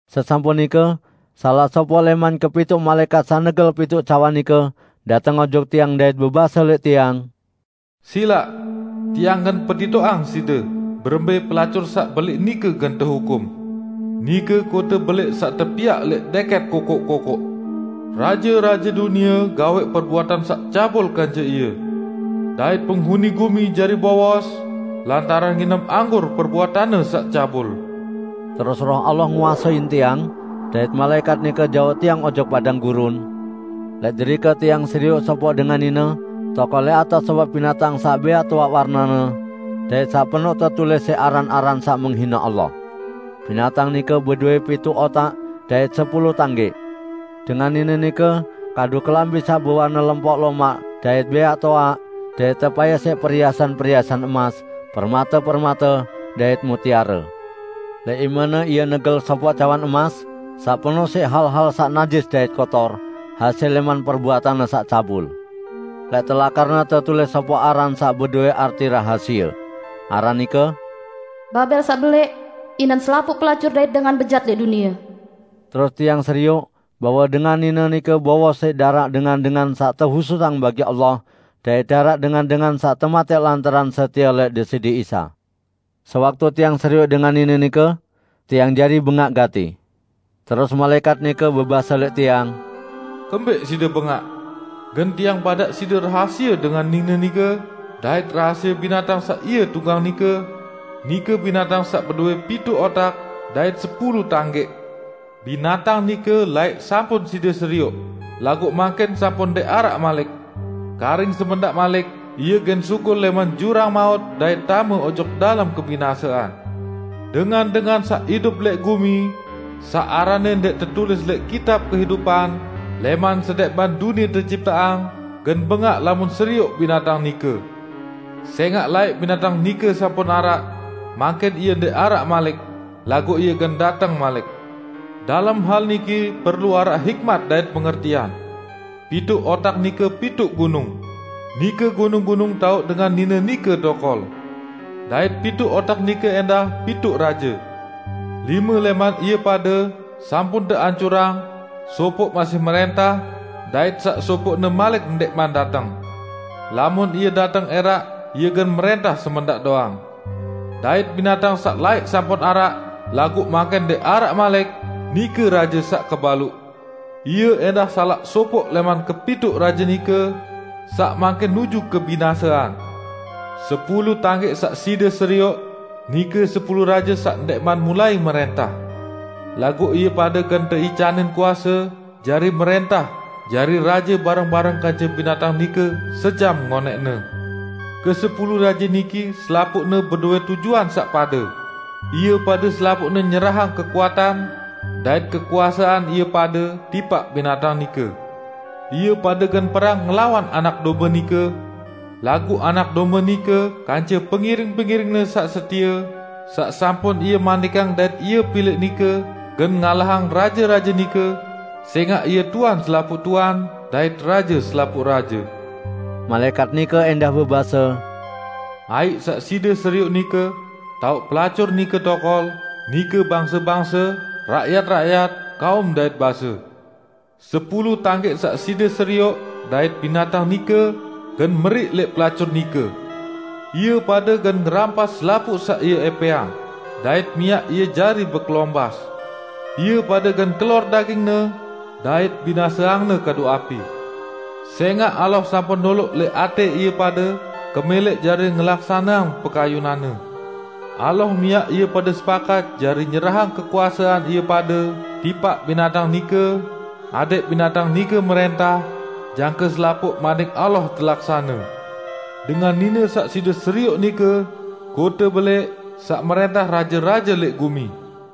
Sesampun nike salaq sopoq lẽman kepituq malaẽkat saq negel pituq cawan nike dateng ojok tiang dait bebase lẽq tiang, "Silaq, tiang gen petitoqang side berembẽ pelacur saq belẽq nike gen tehukum, nike kote belẽq saq tepiaq lẽq dẽkẽt kokoq-kokoq. Raje-raje dunie gawẽq perbuatan saq cabul kance ie, dait penghuni gumi jari bowos lantaran nginem anggur perbuatanne saq cabul." Terus Roh Allah nguasein tiang, dait malaẽkat nike jauq tiang ojok padang gurun, lẽq derike tiang serioq sopoq dengan nine tokol lẽq atas sopoq binatang saq bẽaq toaq warnene, dait saq penoq tetulis siq aran-aran saq menghine Allah. Binatang nike bedowẽ pituq otak dait sepulu tanggẽq. Dengan nine nike kadu kelambi saq bewarne lempok lomaq dait bẽaq toaq, dait tepayas siq periasan-periasan emas, permate-permate, dait mutiare. Lẽq imene ie negel sopoq cawan emas saq penoq siq hal-hal saq najis dait kotor, hasil lẽman perbuatanne saq cabul. Lẽq telakarne tetulis sopoq aran saq bedowẽ arti rahasie. Aran nike "Babel Saq Belẽq, inen selapuq pelacur dait dengan bejat lẽq dunie." Terus tiang serioq bahwe dengan nine nike bowos siq daraq dengan-dengan saq tehususang bagi Allah dait daraq dengan-dengan saq tematẽq lantaran setie lẽq Deside Isa. Sewaktu tiang serioq dengan nine nike, tiang jari bengaq gati. Terus malaẽkat nike bebase lẽq tiang, "Kembẽq side bengaq? Gen tiang badaq side rahasie dengan nine nike dait rahasie binatang saq ie tunggang nike, nike binatang saq bedowẽ pituq otak dait sepulu tanggẽq. Binatang nike laẽq sampun side serioq, laguq mangkin sampun ndẽq araq malik. Karing semendaq malik ie gen sugul lẽman jurang maut dait tame ojok dalem kebinasean. Dengan-dengan saq idup lẽq gumi, saq aranne ndẽq tetulis lẽq kitab kehidupan lẽman sendẽqman dunie tecipteang gen bengaq lamun serioq binatang nike. Sẽngaq laẽq binatang nike sampun araq, mangkin ie ndẽq araq malik, laguq ie gen dateng malik. Dalem hal niki perlu araq hikmat dait pengertian. Pituq otak nike pituq gunung; nike gunung-gunung taoq dengan nine nike tokol. Dait pituq otak nike ẽndah pituq raje: Lime lẽman ie pade sampun teancurang, sopoq masih mrẽntah, dait saq sopoqne malik ndẽqman dateng. Lamun ie dateng ẽraq ie gen mrẽntah semendaq doang. Dait binatang saq laẽq sampun araq, laguq mangkin ndẽq araq malik, nike raje saq kebaluq. Ie ẽndah salaq sopoq lẽman kepituq raje nike, saq mangkin nuju kebinasean. Sepulu tanggẽq saq side serioq, nike sepulu raje saq ndẽqman mulai mrẽntah. Laguq ie pade gen teicanin kuase jari mrẽntah jari raje bareng-bareng kance binatang nike sejam ngonẽqne. Kesepulu raje niki selapuqne bedowẽ tujuan saq pade; ie pade selapuqne nyerahang kekuatan dait kekuasean ie pade tipaq binatang nike. Ie pade gen perang ngelawan Anak Dombe nike. Laguq Anak Dombe nike kance pengiring-pengiring-Ne saq setie saq sampun Ie manikang dait Ie pilẽq nike gen ngalahang raje-raje nike, sẽngaq Ie Tuan selapuq tuan, dait Raje selapuq raje." Malaẽkat nike ẽndah bebase, "Aiq saq side serioq nike, taoq pelacur nike tokol, nike bangse-bangse, rakyat-rakyat, kaum dait base. Sepulu tanggẽq saq side serioq dait binatang nike gen meriq lẽq pelacur nike. Ie pade gen ngerampas selapuq saq ie ẽpẽang, dait miaq ie jari bekelombas. Ie pade gen kelor dagingne dait binaseangne kadu api. Sẽngaq Allah sampun noloq lẽq atẽ ie pade kemẽlẽq jari ngelaksaneang pekayunan-Ne. Allah miaq ie pade sepakat jari nyerahang kekuasean ie pade tipaq binatang nike, adẽq binatang nike mrẽntah, jangke selapuq Manik Allah telaksane. Dengan nine saq side serioq nike, kote belẽq, saq mrẽntah raje-raje lẽq gumi."